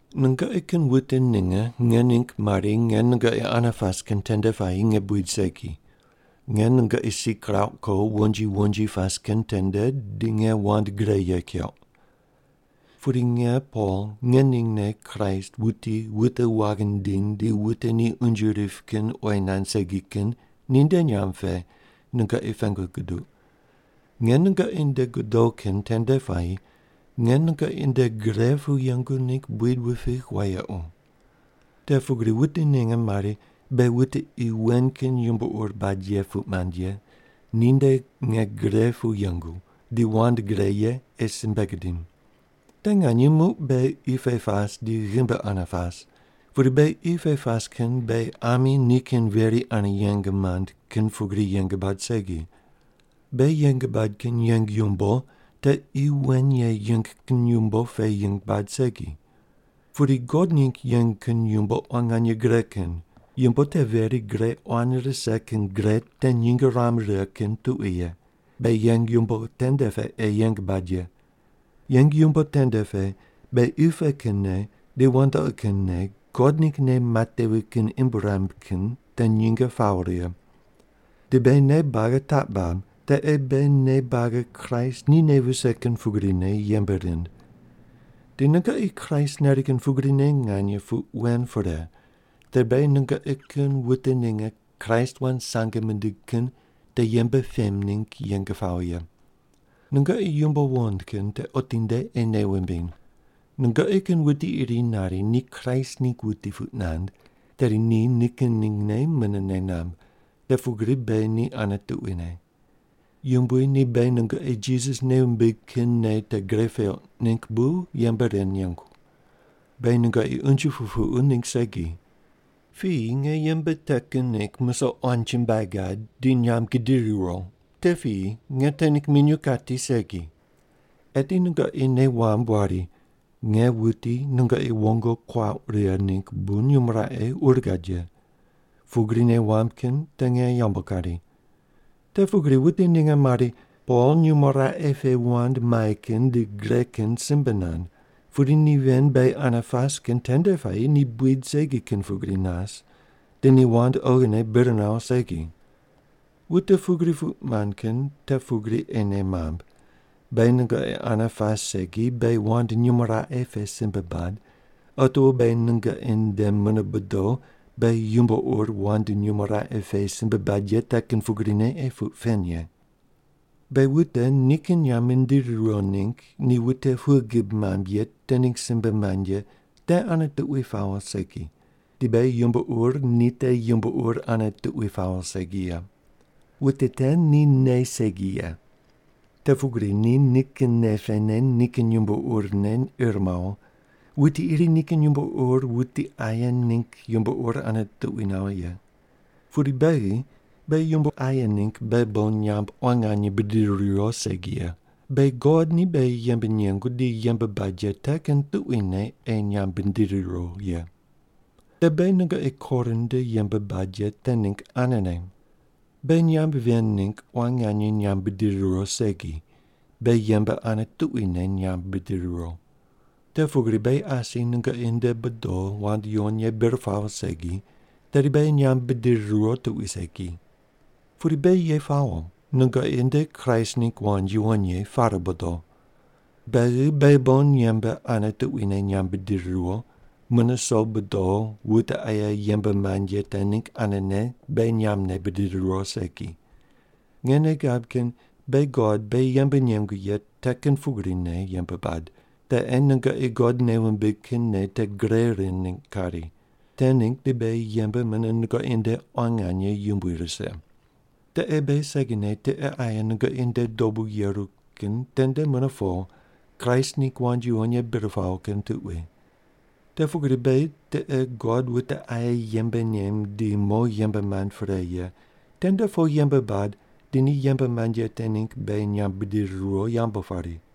Nungoqi kin wute ninge nge ningg mari nge nungoqi ane pas kin tende puayi nge buid segi, nge nungoqi si kirauq ko wonji wonji pas kin tende di nge wand gre ye keuq. Pudi nge Pol ngeningne Kraist wuti wute waghi nindiny di wute ni unje rip kin oyi nand segi kin ninde nyamb pe nungoqi pengu guduq, nge nungoqi nde godo kin tende puayi nge nungoqi nde gre pu yengu ningg buid wupigh wayequ. Te pugri wute ninge mari beghi wute qi wen kin yumbo ur bad ye puq mand ye ninde nge gre pu yengu di wand gre ye ei simbe gidim. Te nganye muq beghi qi pe pas di ghimbi ane pas, pudi beghi qi pe pas kin beghi ami nikin veri ane yeng mand kin pugri yeng bad segi. Beghi yeng bad kin yeng yumbo te qi wen ye yeng kin yumbo pe yeng bad segi. Pudi God ningg yeng kin yumbo quan nganye gre kin, yumbo te veri gre quan rise kin gre te nyinge ruam righe kin tuqui ye, beghi yeng yumbo tende pe ei yeng bad ye. Yeng yumbo tende pe beghi qi pe kin nei di wandoqi kin nei God ningg nei matevi kin imb ruam kin te nyinge pawo righe. Di beghi nei buagi taq bab te ei beghi nei buagi Kraist ni nei vise kin pugrine yembe rind. Di nungoqi Kraist nari kin pugrine nganye puq wen pre, tedi beghi nungoqi kin wute ninge Kraist wand sange mindig kin te yembe pem ningg yeng pawo ye. Nungoqi yumbo wuqond kin te otinde ei nei wumbiny. Nungoqi kin wuti iri nari ni Kraist ningg wuti puq nand, tedi ni nikin ningne mune nei namb, te pugri beghi ni ane tuquine. Yumbui ni beghi nungoqi Jisas nei wumbig kin nei te gre peuq ningg bu yembe ren nengu. Beghi nungoqi unje pupuqu ningg segi. Piyi nge yembe te kin ningg musoq quan chumbuai gad di nyamb gidiri riwo, te piyi, nge te ningg minyuw kati segi. Eti nungoqi nei wamb wari nge wuti nungoqi woingo kuauq righe ningg bu nyumo raqe ur gad ye, pugri nei wamb kin te nge yambu kari. Te pugri wute ninge mari, “Pol nyumo raqe pe wand mai kin di gre kin simbe nand, pudi ni ven beghi ane pas kin tende puayi ni buid segi kin pugri nas, di ni wand oghine bir nawo segi.” Wute pugri puq mand kin te pugri ei nei mamb, beghi nungoqi ane pas segi beghi wand nyumo raqe pe simbe bad, otiwo beghi nungoqi nde mune bodo beghi yumbo ur wand nyumo raqe pe simbe bad ye te kin pugrine ei puq pen ye. Beghi wute nikin nyamb mindiri riwo ningg ni wute pughe gib mamb ye te ningg simbe mand ye te ane tuqui pawo segi, di beghi yumbo ur ni te yumbo ur ane tuqui pawo segi ye. Wute te ni nei segi ye. Te pugri ni nikin nei pene nikin yumbo urne ir mawo, wuti iri nikin yumbo ur wuti aye ningg yumbo ur ane tuqui nawo ye. Pudi beghi, beghi yumbo aye ningg beghi bon nyamb quan nganye bidiri riwo segi ye, beghi God ni beghi yembe nengu di yembe bad ye te kin tuquine ei nyamb bidiri riwo ye. Te beghi nungoqi Korin nde yembe bad ye te ningg anene. Beghi nyamb ven ningg quan nganye nyamb bidiri riwo segi, beghi yembe ane tuquine nyamb bidiri riwo. Te pugri beghi asi nungoqi nde bodo wand yuwon ye bir pawo segi, tedi beghi nyamb bidiri riwo tuqui segi. Pudi beghi ye pawo nungoqi nde Kraist ningg wand yuwon ye pare bodo. Beghi beghi bon yembe ane tuquine nyamb bidiri riwo, mune so bodo wute aye yembe mand ye te ningg anene beghi nyambne bidiri riwo segi. Nge nei gab kin beghi God beghi yembe nengu ye te kin pugrine yembe bad, te ei nungoqi God nei wumbig kin nei te gre rind ningg kari, te ningg di beghi yembe mune nungoqi nde quan nganye yumbui rise. Te ei beghi segine tiqe aye nungoqi nde dobu yeru kin tende mune po Kraist ningg wand yuwon ye bir pawo kin tuqui. Te pugri beghi tiqe God wute aye yembe nem di mo yembe mand pre ye tende po yembe bad di ni yembe mand ye te ningg beghi nyamb bidiri riwo yambu pari.